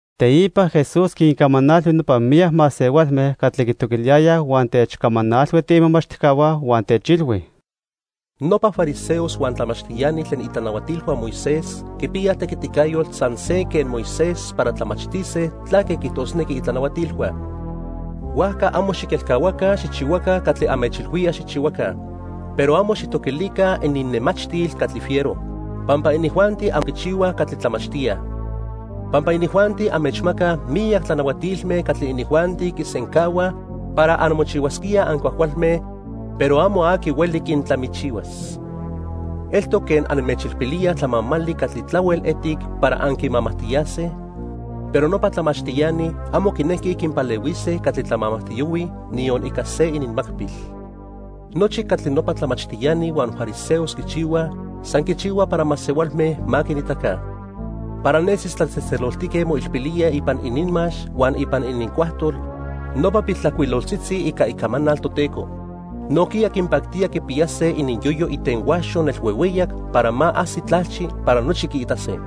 Teipa, Jesús quincamanalhui nopa miyac masehualme catli quitoquiliyayaj huan techcamanalhui tiimomachtijcahua huan techilhui: "Nopa fariseos huan tlamachtiani tlen itlanahuatilhua Moisés quipiyaj tequiticayotl san se quen Moisés para tlamachtise tlaque quiijtosnequij itlanahuatilhua. Huajca amo xiquelcahuaca xijchihuaca catli anmechilhuíaj xijchihuaca. Pero amo xijtoquilica ininnemachtil catli fiero, pampa inijuanti amo quichihuaj catli tlamachtíaj. Pampa inijuanti anmechmacaj miyac tlanahuatilme catli inijuanti quisencahuaj para anmochihuasquíaj ancuajcualme, pero amo aqui hueli quintlamichihuas. Eltoc quen anmechilpilíaj tlamamali catli tlahuel etic para anquimamajtiyase, pero nopa tlamachtiani amo quinequij quinpalehuise catli tlamamajtiyohuij niyon ica se ininmacpil. Nochi catli nopa tlamachtiani huan fariseos quichihuaj, san quichihuaj para masehualme ma quinitaca. Para nesis tlatzejtzeloltique moilpilíaj ipan ininmax huan ipan inincuajtol nopa piltlajcuiloltzitzi ica Icamanal Toteco. Nojquiya quinpactía quipiyase ininyoyo itenhuaxo nelhuehueyac para ma ajsi tlalchi para nochi quiitase.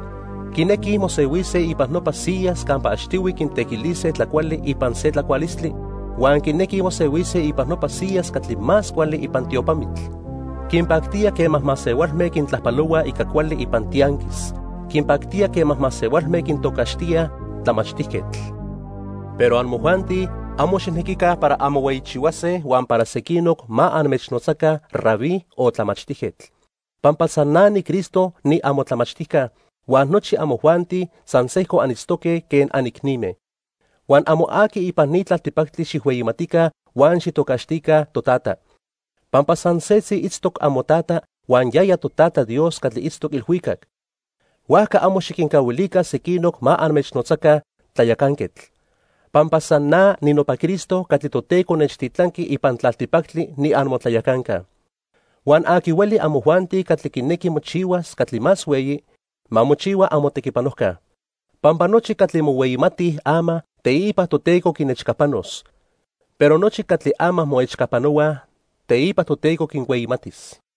Quinequij mosehuise ipan nopa siyas campa achtihui quintequilise tlacuali ipan se tlacualistli, huan quinequij mosehuise ipan nopa siyas catli más cuali ipan tiopamitl. Quinpactía quema masehualme quintlajpalohuaj ica cuali ipan tianquis. Quinpactía quema masehualme quintocaxtíaj 'Tlamachtijquetl'. "Pero amojuanti amo xijnequica para anmohueyichihuase huan para sequinoc ma anmechnotzaca 'Rabí' o 'Tlamachtijquetl', pampa san na niCristo niamotlamachtijca, huan nochi amojuanti san sejco anitztoque quen anicnime. Huan amo aqui ipan ni tlaltipactli xijhueyimatica huan xijtocaxtica 'Totata', pampa san setzi itztoc amoTata huan yaya Totata Dios catli itztoc ilhuicac. Huajca amo xiquincahuilica sequinoc ma anmechnotzaca 'Tlayacanquetl' pampa san na ninopa Cristo catli Toteco nechtitlanqui ipan tlaltipactli niamotlayacanca. Huan aqui hueli amojuanti catli quinequi mochihuas catli más hueyi, ma mochihua amotequipanojca. Pampa nochi catli mohueyimatij ama, teipa Toteco quinechcapanos, pero nochi catli ama moechcapanohuaj, teipa Toteco quinhueyimatis.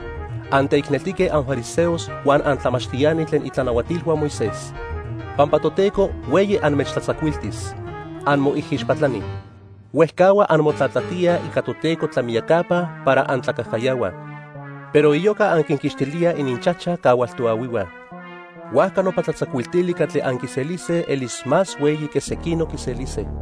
"¡Anteicneltique anfariseos huan antlamachtiani tlen itlanahuatilhua Moisés, pampa Toteco hueyi anmechtlatzacuiltis! Anmoijixpatlani. Huejcahua anmotlatlajtíaj ica Toteco tlamiyacapa para antlacajcayahuaj, pero iyoca anquinquixtilíaj ininchajchaj cahual toahuihua. Huajca nopa tlatzacuiltili catli anquiselise elis más hueyi que sequinoc quiselise.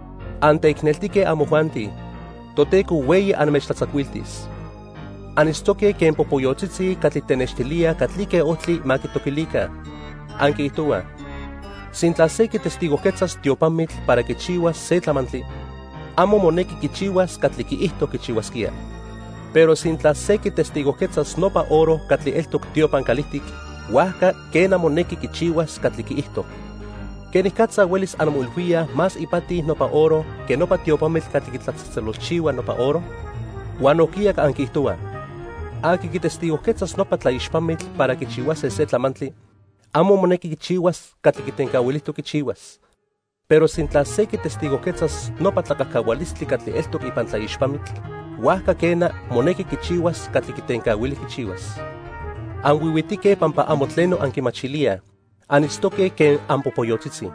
"¡Anteicneltique amojuanti, Toteco hueyi anmechtlatzacuiltis! Anitztoque quen popoyotzitzi catli tenextilíaj catlique ojtli ma quitoquilica. Anquiijtohuaj: 'Sintla se quitestigojquetzas tiopamitl para quichihuas se tlamantli, amo monequi quichihuas catli quiijto quichihuasquía. Pero sintla se quitestigojquetzas nopa oro catli eltoc tiopan calijtic, huajca, quena, monequi quichihuas catli quiijto.' ¿Quenicatza huelis anmoilhuíaj más ipati nopa oro que nopa tiopamitl catli quitlatzejtzelolchihua nopa oro? Huan nojquiya anquiijtohuaj: 'Aqui quitestigojquetzas nopa tlaixpamitl para quichihuase se tlamantli, amo monequi quichihuas catli quitencahuilijtoc quichihuas, pero sintla se quitestigojquetzas nopa tlacajcahualistli catli eltoc ipan tlaixpamitl, huajca quena, monequi quichihuas catli quitencahuili quichihuas.' ¡Anhuihuitique pampa amo tleno anquimachilíaj! Anitztoque quen anpopoyotzitzi.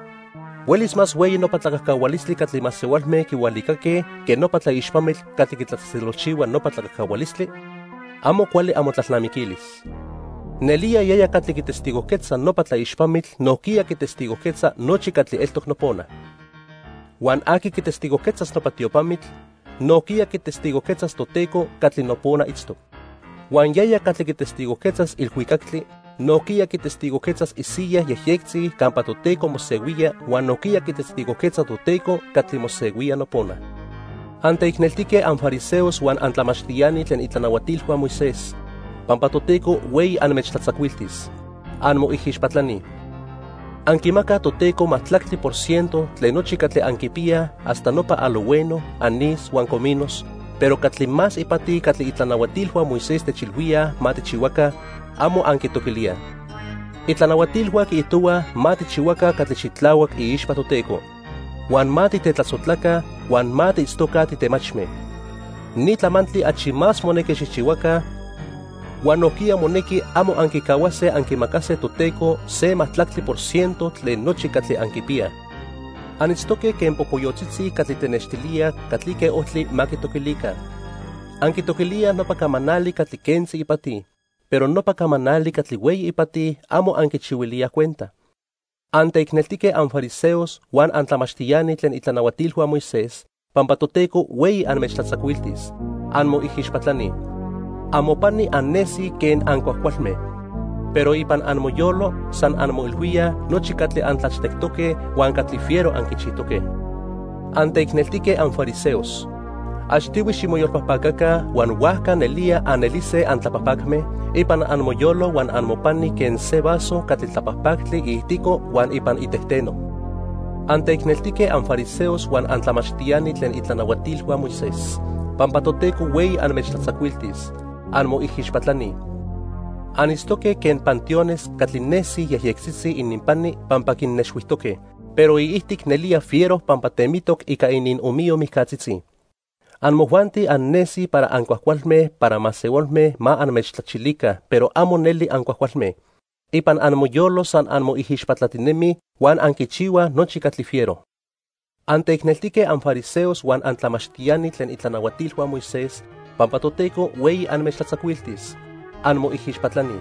¿Huelis más hueyi nopa tlacajcahualistli catli masehualme quihualicaque, que nopa tlaixpamitl catli quitlatzejtzelolchihua nopa tlacajcahualistli? ¡Amo cuali amotlalnamiquilis! Nelía yaya catli quitestigojquetza nopa tlaixpamitl nojquiya quitestigojquetza nochi catli eltoc nopona. Huan aqui quitestigojquetzas nopa tiopamitl, nojquiya quitestigojquetzas Toteco catli nopona itztoc. Huan yaya catli quitestigojquetzas ilhuicactli, nojquiya quitestigojquetzas isiyaj yejyectzi campa Toteco mosehuía huan nojquiya quitestigojquetza Toteco catli mosehuía nopona. "¡Anteicneltique anfariseos huan antlamachtiani tlen itlanahuatilhua Moisés, pampa Toteco hueyi anmechtlatzacuiltis! ¡Anmoijixpatlani! Anquimacaj Toteco majtlactli por ciento tlen nochi catli anquipiyaj hasta nopa alojhueno, anís huan cominos, pero catli más ipati catli itlanahuatilhua Moisés techilhuíaj ma tijchihuaca, amo anquitoquilíaj. Itlanahuatilhua quiijtohuaj ma tijchihuaca catli xitlahuac iixpa Toteco, huan ma titetlasojtlaca, huan ma tiitztoca titemachme. Ni tlamantli achi más monequi xijchihuaca, huan nojquiya monequi amo anquicahuase anquimacase Toteco se majtlactli por ciento tlen nochi catli anquipiyaj. Anitztoque quen popoyotzitzi catli tenextilíaj catlique ojtli ma quitoquilica. Anquitoquilíaj nopa camanali catli quentzi ipati, pero nopa camanali catli hueyi ipati, amo anquichihuilíaj cuenta. "¡Anteicneltique anfariseos huan antlamachtiani tlen itlanahuatilhua Moisés, pampa Toteco hueyi anmechtlatzacuiltis! Anmoijixpatlani. Amopani annesij quen ancuajcualme, pero ipan amoyolo san anmoilhuíaj nochi catli antlachtectoque huan catli fiero anquichijtoque. ¡Anteicneltique anfariseos! Achtihui ximoyolpajpacaca, huan huajca nelía anelise antlapajpacme ipan amoyolo huan amopani quen se vaso catli tlapajpactli iijtico huan ipan itejteno. "¡Anteicneltique anfariseos huan antlamachtiani tlen itlanahuatilhua Moisés, pampa Toteco hueyi anmechtlatzacuiltis! Anmoijixpatlani. Anitztoque quen panteones catli nesij yejyectzitzi ininpani pampa quinnexhuijtoque, pero iijtic nelía fiero pampa temitoc ica iniomiyo mijcatzitzi. Amojuanti annesij para ancuajcualme para masehualme ma anmechtlachilica, pero amo neli ancuajcualme. Ipan amoyolo san anmoijixpatlatinemij huan anquichihuaj nochi catli fiero. "Anteicneltique anfariseos huan antlamachtiani tlen itlanahuatilhua Moisés, pampa Toteco hueyi anmechtlatzacuiltis. ¡Anmoijixpatlani!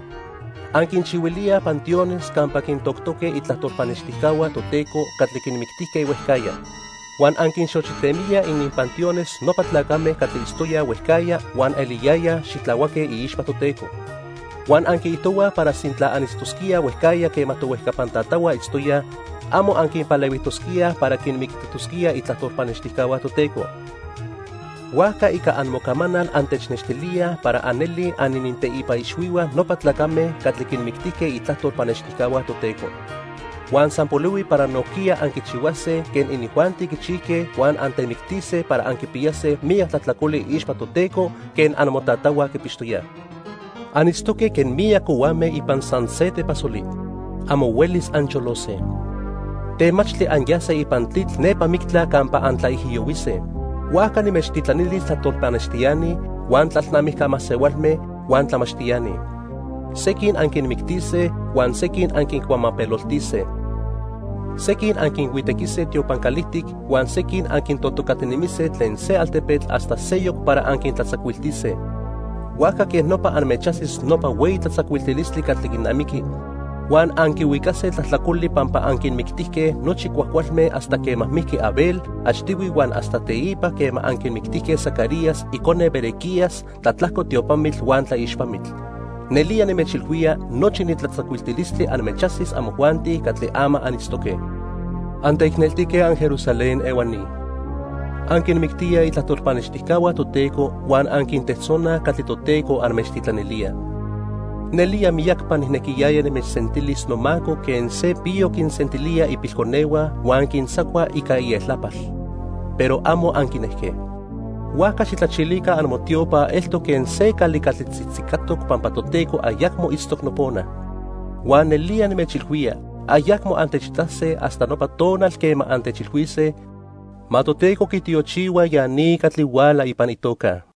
Anquinchihuilíaj panteones campa quintoctoque itlajtol pannextijcahua Toteco catli quinmictijque huejcajya. Huan anquinxochitemíaj ininpanteones nopa tlacame catli itztoyaj huejcajya huan eliyayaj xitlahuaque iixpa Toteco. Huan anquiijtohuaj para sintla anitztosquíaj huejcajya quema tohuejcapan tatahua itztoyaj, amo anquinpalehuijtosquíaj para quinmictijtosquíaj itlajtol pannextijcahua Toteco. Huajca ica amocamanal antenextilíaj para anelij anininteipa ixhuihua nopa tlacame catli quinmictijque itlajtol pannextijcahua Toteco. Huan san polihui para nojquiya anquichihuase quen inijuanti quichijque huan antemictise para anquipiyase miyac tlajtlacoli iixpa Toteco quen amotatahua quipixtoyaj. "Anitztoque quen miyac cohuame ipan san se tepasoli. Amo huelis ancholose. Temachtli anyase ipan tlitl nepa mictla campa antlaijiyohuise. Huajca nimechtitlanilis tlajtol pannextiani, huan tlalnamijca masehualme, huan tlamachtiani. Sequin anquinmictise huan sequin anquincuamapeloltise. Sequin anquinhuitequise tiopan calijtic huan sequin anquintojtocatinemise tlen se altepetl hasta seyoc para anquitlatzacuiltise. Huajca quej nopa anmechajsis nopa hueyi tlatzacuiltilistli catli quinamiqui, huan anquihuicase tlajtlacoli pampa anquinmictijque nochi cuajcualme hasta quema mijqui Abel achtihui huan hasta teipa quema anquimictijque Zacarías icone Berequías tlatlajco tiopamitl huan tlaixpamitl. Nelía nimechilhuía nochi ni tlatzacuiltilistli anmechajsis amojuanti catli ama anitztoque. "¡Anteicneltique anJerusalén ehuani! Anquinmictíaj itlajtol pannextijcahua Toteco huan anquintejtzonaj catli Toteco anmechtitlanilía. Nelía miyacpa nijnequiyaya nimechsentilis nomaco quen se piyo quinsentilía ipilconehua huan quintzacua ica ieltlapal, pero amo anquinejque. Huajca xijtlachilica amotiopa eltoc quen se cali catli tzitzicatoc pampa Toteco ayacmo itztoc nopona. Huan nelía nimechilhuía ayacmo antechitase hasta nopa tonal quema antechilhuise: 'Ma Toteco quitiochihua ya ni catli huala ipan itoca.' "